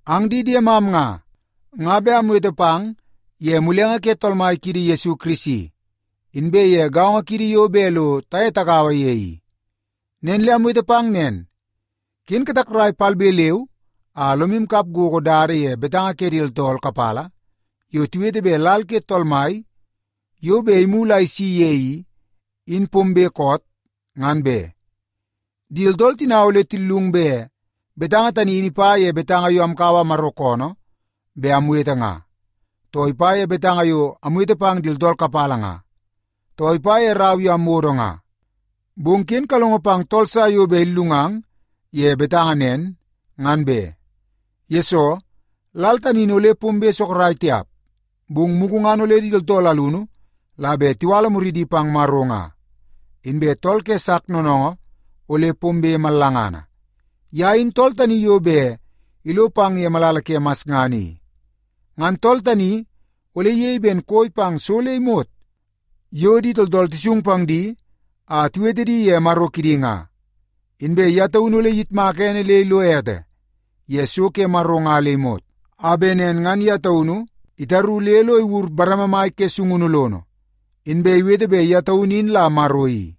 Ang di diemam nga, nga bet amwete pang ye mulenge ke Tool Mai kiidi Yesu Kirisi, inbe ye gaongo kiidi yo bet lo taye tagaua ye i. Nen le amwete pang nen, ken katakrai palbe leu a lomu kap gogo dada ye betanga ke di tooltool kapala yo tiwete bet lal ke Tool Mai yo bet imulu a isi ye i, in pombe koot, ngan be. Di tooltool tina ole tillung bet betanga tani in ipa ye betanga yo amkaua Maro koonoo bet amwete nga, too ipa ye betanga yo amwete pang di tooltool kapala nga, too ipa ye rau yo amwodo nga. Bong ken kalongo pang tool sa yo bet illungang ye betanga nen, ngan be. Yesoo, lal tani in ole pombe sorok tiap, bong mugu ngan ole di tooltool alunu la bet tiwala muridi pang Maro nga, inbe tool ke sak noonoongoo ole pombe mallangana. Ye in tool tani yo bet ilo pang ye malala ke masngana i. Ngan tool tani ole iyei ben koi pang so le imot yo di tooltool tisung pang di a tiwete di ye maro kidi nga. Inbe ye taunu ole iyitmaka ene le ilo ete ye so ke Maro nga le imot, a bet nen ngan ye taunu itaru le lo iwur bareme mai ke sungunu lono, inbe iwete bet ye taunu in la Maro i.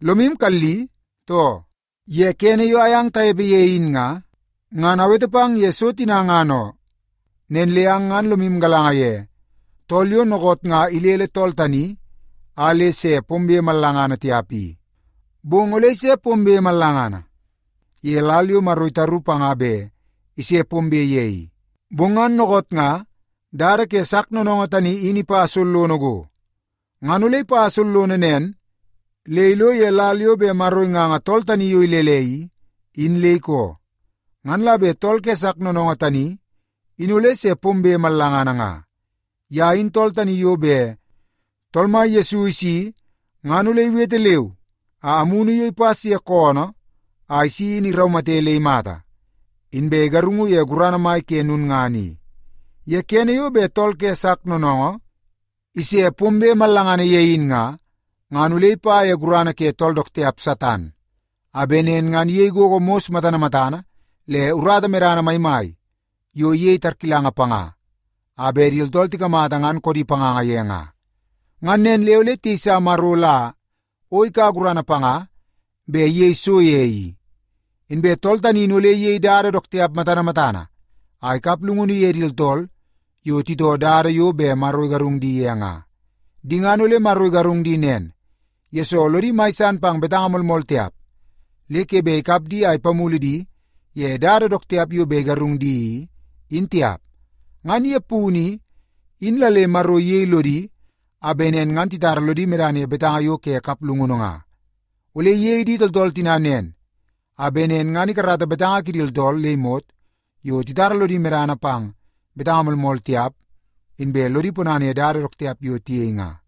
Lomu kalli, too? Ye kene yo ayang tanepe ye in nga, ngan awete pang ye so tina ngan oo. Nen le ang ngan lomu galanga ye tool yo dookoot nga ilele tool tani a le se pombe mallangana tiap i. Bong ole ise pombe mallangana ye lal yo Maro itaru panga bet ise pombe ye i. Bong ngan dookoot nga dada ke sak noonoongoo in ipa sollono go. Ngan ole ipa sollono nen le ilo ye lal yo bet Maro inganga tool tani yo ilele i, in le ikoo, ngan la bet tool ke sak noonoongoo tani in ole se pombe mallangana nga. Ye in tool tani yo bet Tool Mai Yesu isi ngan ole iwete leu a amunu yo ipas ye koonoo a isi in iraumate le imata, inbe igarungu ye gurana mai ke lulngana i. Ye kene yo bet tool ke sak noonoongoo ise pombe mallangana ye in nga, ngan ole ipa ye gurana ke tool dook tiap Satan, a bet nen ngan iyei gogo mos matana matana le urata medana maimai yo iyei tarkilanga panga a bet di tooltool tikamata ngan koodi panganga ye nga. Ngan nen le ole tiyeisa Maro la o ikaua gurana panga bet iyei so ye i. Inbe tool tani in ole iyei dada dook tiap matana matana a ikap llungunu ye di tooltool yo titoo dada yo bet Maro igarung di ye nga. Di ngan ole Maro igarung di nen, yesoo lodi mai san pang betanga moolmool tiap, le ke bet ikap di a ipamulu di ye dada dook tiap yo bet igarung di i, in tiap. Ngan ye punu i, in la le Maro iyei lodi a bet nen ngan titara lodi medana ye betanga yo ke kaplungunu nga. Ole iyei di tooltool tina nen, a bet nen ngan ikarata betanga kidi tooltool le imot yo titara lodi medana pang betanga moolmool tiap, inbe lodi ponana ye dada dook tiap yo tiyei nga.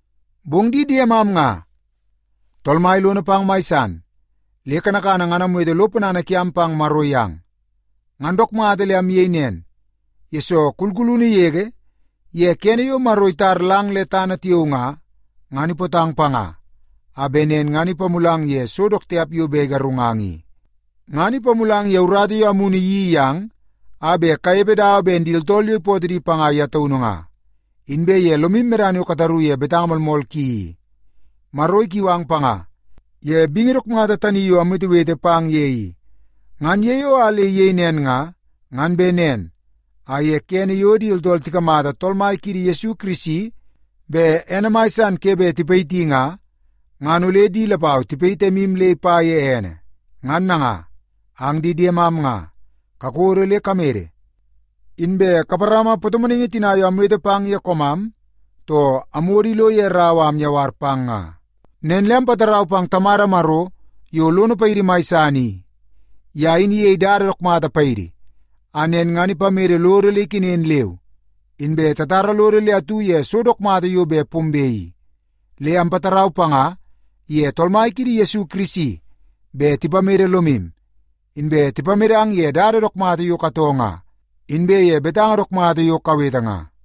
Bong di diemam nga, Tool Mai lono pang mai san le kanakana ngan amwete lo ponana kiam pang Maro yang. Ngan dook mata le amyei nen, yesoo kulkulunu yege ye kene yo Maro itar lang le tana tiao nga, ngan ipootang panga a bet nen ngan ipamulang ye so dook tiap yo bet igarungang i. Ngan ipamulang ye urata yo Amunu iyeii yang a bet kanepe dawa ben di tooltool yo ipootoo di panga ye taunu nga, inbe ye lomu medana yo kataru ye betanga moolmool ki i. Maro ikiu ang panga ye bingi dook mata tani yo amwetewete pang ye i. Ngan ye yo a le iyei nen nga, ngan bet nen a ye kene yo di tooltool tikamata Tool Mai kiidi Yesu Kirisi bet ene mai san ke bet tipayiti nga, ngan ole di lapau tipayit emu le ipa ye ene. Ngan nanga ang di diemam nga, kakodo le kamede. Inbe kaparama patomonaingi tina yo amwete pang ye koomam too amwodo ilo ye rau a amyawar pang nga. Nen le ampatarau pang Tamada Maro yo lono paidi mai san i. Ye in iyei dada dook mata paidi, a nen ngan ipamede lodo le ikenen leu inbe tatara lodo le atu ye so dook mata yo bet pombe i. Le ampatarau panga iye Tool Mai kiidi Yesu Kirisi bet tipamede lomu, inbe tipamedang ye dada dook mata yo katoo nga inbe ye betanga dook mata yo kawete nga.